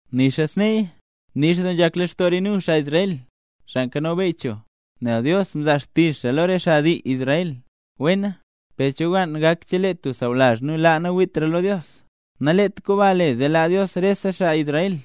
Nixa sneeya, nix doo nzhak lextoo re nu, xaa Israel, xaa nzho beyy cho, nel Dios mzaa xtizh xaa lo re xaa dii Israel. Wena, ¿per cho kwaan gak chelee tub sawlazh nu laa nawiitra lo Dios? Sbaa naleet komba le zee laa Dios rese xaa dii Israel.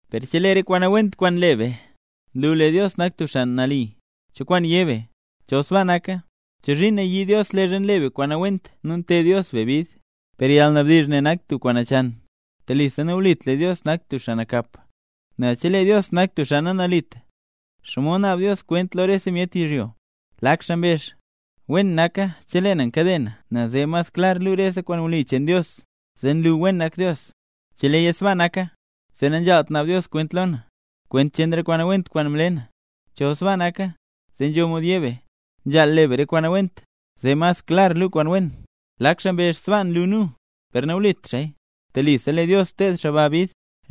Per chelee re kwaan nawent kwaan nle be, nlu lee Dios nak tub xaa nali, ¿cho kwaan yé be? Chol sbaa naka, ¿chozhiin nayii Dios leezha nle be kwaan nawent nu nted Dios be bid? ¡Per yalnabdizh ne nak tub kwaan nachan! ¡Telisa nawlit lee Dios nak tub xaa nakap! Nel chelee Dios nak tub xaa nanalit, ¿xomod naab Dios kwent lo rese myet yizhyo? Lak xaa mbezh: “Wen naka chelee na nkade na nel zee mas klar nlu re kwaan wli cheen Dios, zee nlu wen nak Dios. Cheleeya sbaa naka, zee nanzhaalt naab Dios kwent lo na, kwent cheen re kwaan nawent kwaan mle na.” Chol sbaa naka, zee nzho mod yé be: “Nzhaal le be re kwaan nawent, zee mas klar luu kwaan wen”. Lak xaa mbezh sbaa nlu nu, per nawlit xaaya, telisa lee Dios ted xaa ba bid.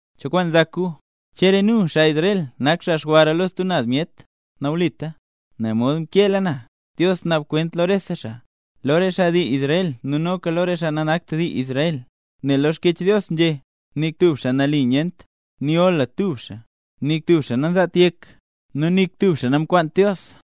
¿Cho kwaan nzak gu? ¿Che re nu, xaa Israel, nak xaa xwara lo stub naz myet? ¡Nawlita! Nel mod mkeela na, Dios naab kwent lo rese xaa, lo re xaa dii Israel nu noka lo re xaa nanakt dii Israel. Nel lo Xkyech Dios nzhé: ¡Nik tub xaa nali nyent! ¡Nik gola tub xaa! Nik tub xaa nanzaat yek, nu nik tub xaa nankwaant Dios.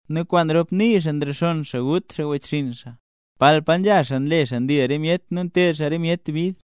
Nu kwaan rop nii xaa nrexonn xaa, gut wechxinn xaa. Palpa nzha xaa nle xaa ndil re myet nu nted xaa re myet bid.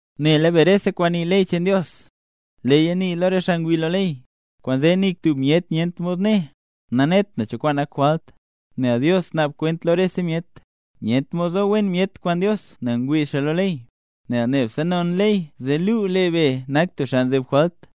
Nela be, rese kwaan nii ley cheen Dios, leeya nii lo re xaa ngwii lo ley. Kwaanzee nik tub myet nyent mod né: “Nanet na cho kwaan nak jwalt”. Nel Dios naab kwent lo rese myet. Nyent mod zo wen myet kwaan Dios nel ngwii xaa lo ley. Nel nebse non ley, zee luu, be nak tub xaa nzeb jwalt.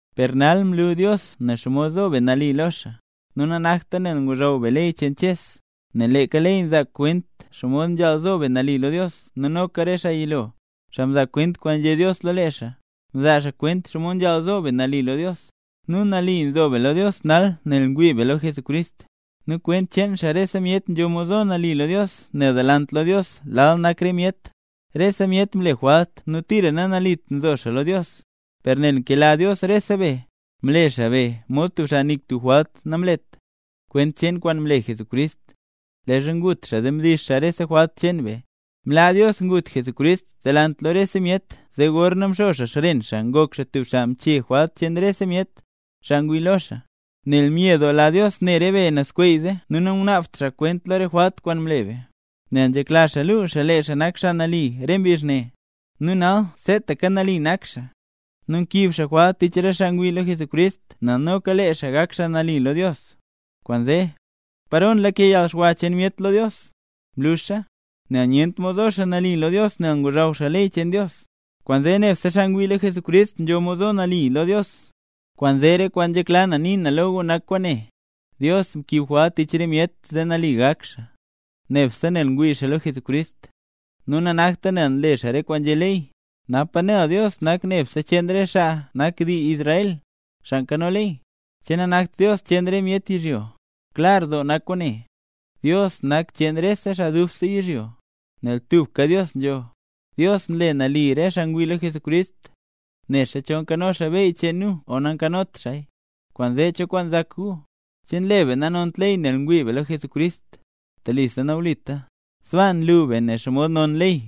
Per nal mlu Dios nen xomod zo be nali lo xaa, nu nanakta nel ngozhaw be ley cheen Ches, nel leeka ley nzaa kwent xomod nzhaal zo be nali lo Dios nu noka re xaa yilo, xaa mzaa kwent kwaan nzhé Dios lo lee xaa, mzaa kwent xomod nzhaal zo be nali lo Dios. Nu nali nzo be lo Dios nal, nel ngwii be lo Jesucrist. Nu kwent cheen xaa rese myet nzho mod zo nali lo Dios nel delant lo Dios lal nak re myet. Rese myet mle jwalt nu tira nanalit nzo xaa lo Dios. Per nel nkela Dios rese be, mle xaa be mod tub xaa nik tub jwalt namlet, kwent cheen kwaan mle Jesucrist, leezha ngut xaa zee mdix xaa rese jwalt cheen be. Mlaa Dios ngut Jesucrist delant lo rese myet zee gorna mxo xaa xren xaa ngok xaa tub xaa mchee jwalt cheen rese myet, xaa ngwii lo xaa. Nel myedoola Dios ne re be nazskweeze, nu nangunaabt xaa kwent lo re jwalt kwaan mle be, nel nzhekla xaa luu xaa lee xaa nak xaa nali re mbizh ne. Nu nal seetaka nali nak xaa, nu nkiib xaa jwalt tich re xaa ngwii lo Jesucrist zee noka lee xaa gak xaa nali lo Dios. Kwaanzee, ¿paro nlake yalxwa cheen myet lo Dios? ¡Mluxa! Nel nyent mod zo xaa nali lo Dios nel ngozhaw xaa ley cheen Dios; kwaanzee nebse xaa ngwii lo Jesucrist nzho mod zo nali lo Dios. Kwaanzee re kwaan nzhekla na nii na lo gu nak kwaane, Dios mkiib jwalt tich re myet zee nali gak xaa, nebse nel ngwii xaa lo Jesucrist, nu nanakta nel nle xaa re kwaan nzhé ley. ¿Napa nel Dios nak Dios nebse cheen re xaa nak xaa dii Israel, xaa nkano ley? ¿Che nanakt Dios cheen rese myet yizhyo? Klar doo nak kwaane, Dios nak Dios cheen rese xaa dubse yizhyo, nel tubka Dios nzho. Dios nle nali re xaa ngwii lo Jesucrist, nexa chol nzho xaa beyy cheen nu o nanzhot xaaya. Kwaanzee, ¿cho kwaan nzak gu? ¿Che nle be nanont ley nel ngwii be lo Jesucrist? ¡Telisa nawlita! Sbaa nlu be nen xomod non ley.